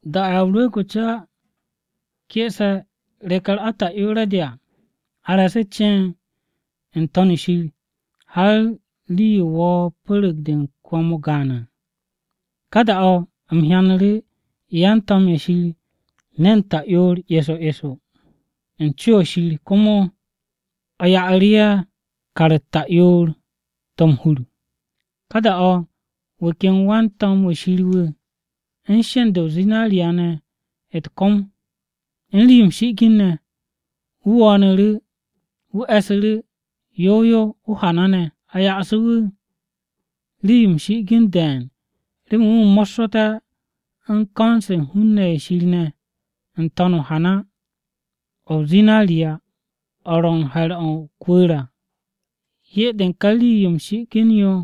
Da-o̱ Ya o-Rwu̱u̱g o-Ca ke'ese̱ reke̱-u̱r ata'yoore̱-de à, a re̱e̱su̱ ceen n-To̱n shir har rii-yo wo̱o̱ pu̱ru̱g-de u̱n kwo̱m-o gaan à. Ka da-o̱ u̱m hyanu̱ru̱ yan-to̱m-ye̱ Shir ne̱n ta'yoor eso eso u̱n co-o̱ Shir, komo a ya'asu̱ru̱ ye̱ kar-u̱t ta'yoor-to̱ m-hur. Ka da-o̱ wu̱ ken wan-to̱m-wu̱ Shir wu̱ u̱n sheend-de o-zinariya ne̱ u̱t-kom de u̱n rii-yo m-shi'igin, wu̱ wo̱o̱nu̱ru̱ wu̱ e̱su̱ru̱ yow yow o-hana ne̱. A ya'asu̱ wu̱ rii-yo m-shi'igin de̱e̱n remen wu̱ mo̱ssu̱té̱ u̱n ko̱n-se u̱n hun-ne̱ ye̱ Shir ne̱, n-to̱n o-hana o-zinariya o̱ ro̱ u̱n he̱r-o̱ o-kwu̱u̱r à. Hyé-de u̱n ka rii-yo m-shi'igin mo̱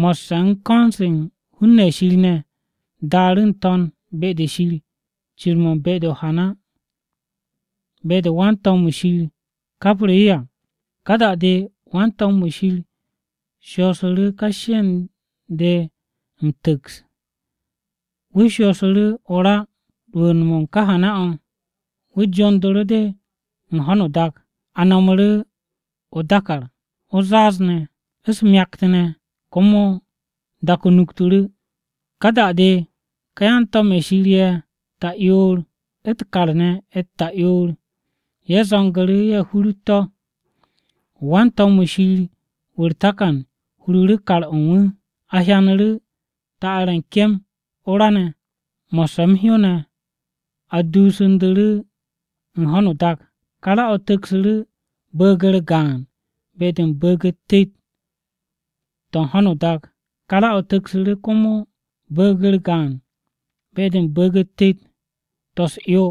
mo̱sse̱ u̱n ko̱n-se u̱n hun-ne̱ ye̱ Shir ne̱, daaru̱ n-to̱n be-de Shir cir-mo̱ u̱n be-de o-hana, be-de wan-to̱m-wu̱ Shir kapru̱ yo à. Ka da-de wan-to̱m-wu̱ Shir shoosu̱ru̱ ka sheend-de m-tu̱ks de wu̱ shoosu̱ru̱ o-ra rwu̱u̱n-mo̱ u̱n ká hana-o̱, wu̱ jondu̱ru̱ de u̱n ho̱no o-dak. A nomoru̱ o-dákàr, o-zaaz ne̱, u̱s-myakt ne̱, komo dak-o nuktu̱ru̱. Ka da-de ká yan-to̱m-ye̱ Shir ye̱ ta'yoor u̱t-kar ne̱ u̱t-ta'yoor ye̱ zo̱ngu̱ru̱ ye̱ hurut to̱. Wan-to̱m-wu̱ Shir wu̱ u̱r-takan hururu̱ kar-o̱ u̱n wu̱. A hyanu̱ru̱ ta'ar-ye̱ u̱n kem o-ra ne̱, mo̱sse̱ m-hyó ne̱ a duusu̱ndu̱ru̱ u̱n ho̱no o-dak. Ka ra-o̱ tu̱ksu̱ru̱ bu̱u̱g-u̱r gaan be-de u̱n bu̱u̱g-u̱t tet-to̱ u̱n ho̱no o-dak, ká ra-o̱ tu̱ksu̱ru̱ komo bu̱u̱g-u̱r gaan be-de u̱n bu̱u̱g-u̱t tet-to̱ u̱s-'yo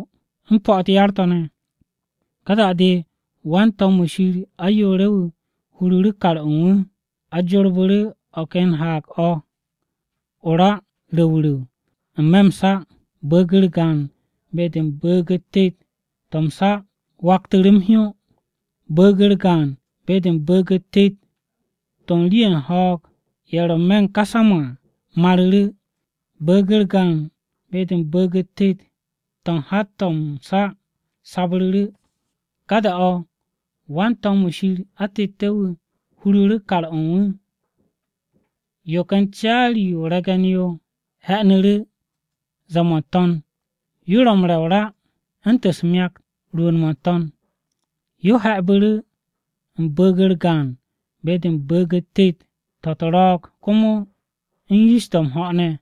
u̱n po̱-u̱t yar-to̱ ne̱. Ka da-de wan-to̱m-wu̱ Shir ayoore̱-wu̱ hururu̱ kar-o̱ u̱n wu̱, a jorbu̱ru̱ o̱ ken haag-o̱ o-ra o-ru̱w ru̱w n-me̱ m-sa. Bu̱u̱g-u̱r gaan be-de u̱n bu̱u̱g-u̱t tet-to̱ m-sa waktu̱ru̱ m-hyó, Bu̱u̱g-u̱r gaan be-de u̱n bu̱u̱g-u̱t tet-to̱ u̱n rii-ye̱ u̱n ho̱o̱g-ye̱ ro̱ n-me̱ u̱n ká sa-mo̱ à maru̱ru̱. Bu̱u̱g-u̱r gaan be-de u̱n bu̱u̱g-u̱t tet-to̱ u̱n hat-to̱ m-sa sabru̱ru̱. Ká da-o̱ wan-to̱m-wu̱ Shir atette̱-wu̱ hururu̱ kar-o̱ u̱n wu̱. Yo ken caari-yo o-re̱ge̱n yo he̱'e̱nu̱ru̱ ze̱e̱-mo̱ n-to̱n yo ro̱ u̱n re̱ o-ra u̱ntu̱n u̱s-myak rwu̱u̱n-mo̱ n-to̱n. Yo he̱'e̱bu̱ru̱ u̱n bu̱u̱g-u̱r gaan be-de u̱n bu̱u̱g-u̱t tet-to̱ u̱t-ro̱o̱g komo u̱n yish-to̱ m-ho̱ ne̱.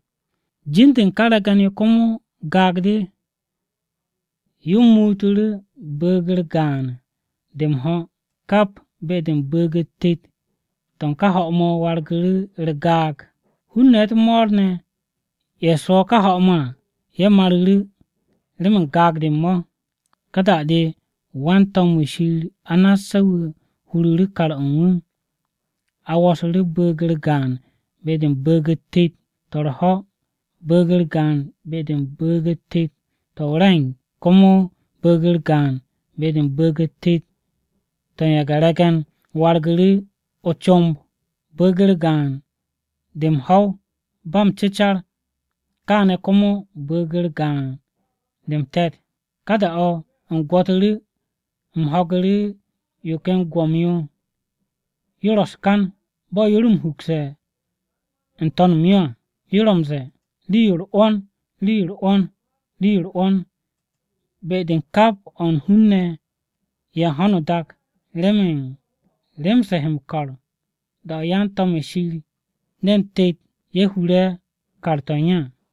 Jin-de u̱n ká re̱ge̱n-yo komo “Gaag-de.” Yo muutu̱ru̱ bu̱u̱g-u̱r gaan-de m-ho̱ kap be-de u̱n bu̱u̱g-u̱t tet-to̱ u̱n ká ho̱-mo̱ wargu̱ru̱ u̱r-gaag. Hun-ne̱ u̱t-mo̱o̱r ne̱ ye̱ swo̱ ká ho̱-mo̱ à ye̱ maru̱ru̱, remen gaag-de u̱n mo̱. Ka da-de wan-to̱m-wu̱ Shir anasse̱-wu̱ huru̱ru̱ kar-o̱ u̱n wu̱. A wo̱su̱ru̱ bu̱u̱g-u̱r gaan be-de u̱n bu̱u̱g-u̱t tet-to̱ u̱r-ho̱, bu̱u̱g-u̱r gaan be-de u̱n bu̱u̱g-u̱t tet-to̱ o-re̱ng, komo bu̱u̱g-u̱r gaan be-de u̱n bu̱u̱g-u̱t tet-to̱ u̱n ye̱ge̱-re̱ge̱n wargu̱ru̱ o-comb. Bu̱u̱g-u̱r gaan-de m-ho̱w ba m-cecar, kaane̱ komo bu̱u̱g-u̱r gaan-de m-te̱t. Ka da-o̱ u̱m gwo̱tu̱ru̱, u̱m ho̱gu̱ru̱ yo ken gwo̱m-yo yo ro̱ u̱s-kan bo̱ yo ro m-hukse̱ n-to̱n m-yo à. Yo ro̱ m-ze̱e̱, “Rii-yo u̱r-'wo̱n! Rii-yo u̱r-'wo̱n! Rii-yo u̱r-'wo̱n, be-de u̱n kap o̱ u̱n hun-ne̱ ye̱ u̱n ho̱no o-dak remen rem-se he m-ko̱r da-o̱ yan-to̱m-ye̱ Shir ne̱n tet ye̱ hure̱ kar-to̱ u̱n ye̱!”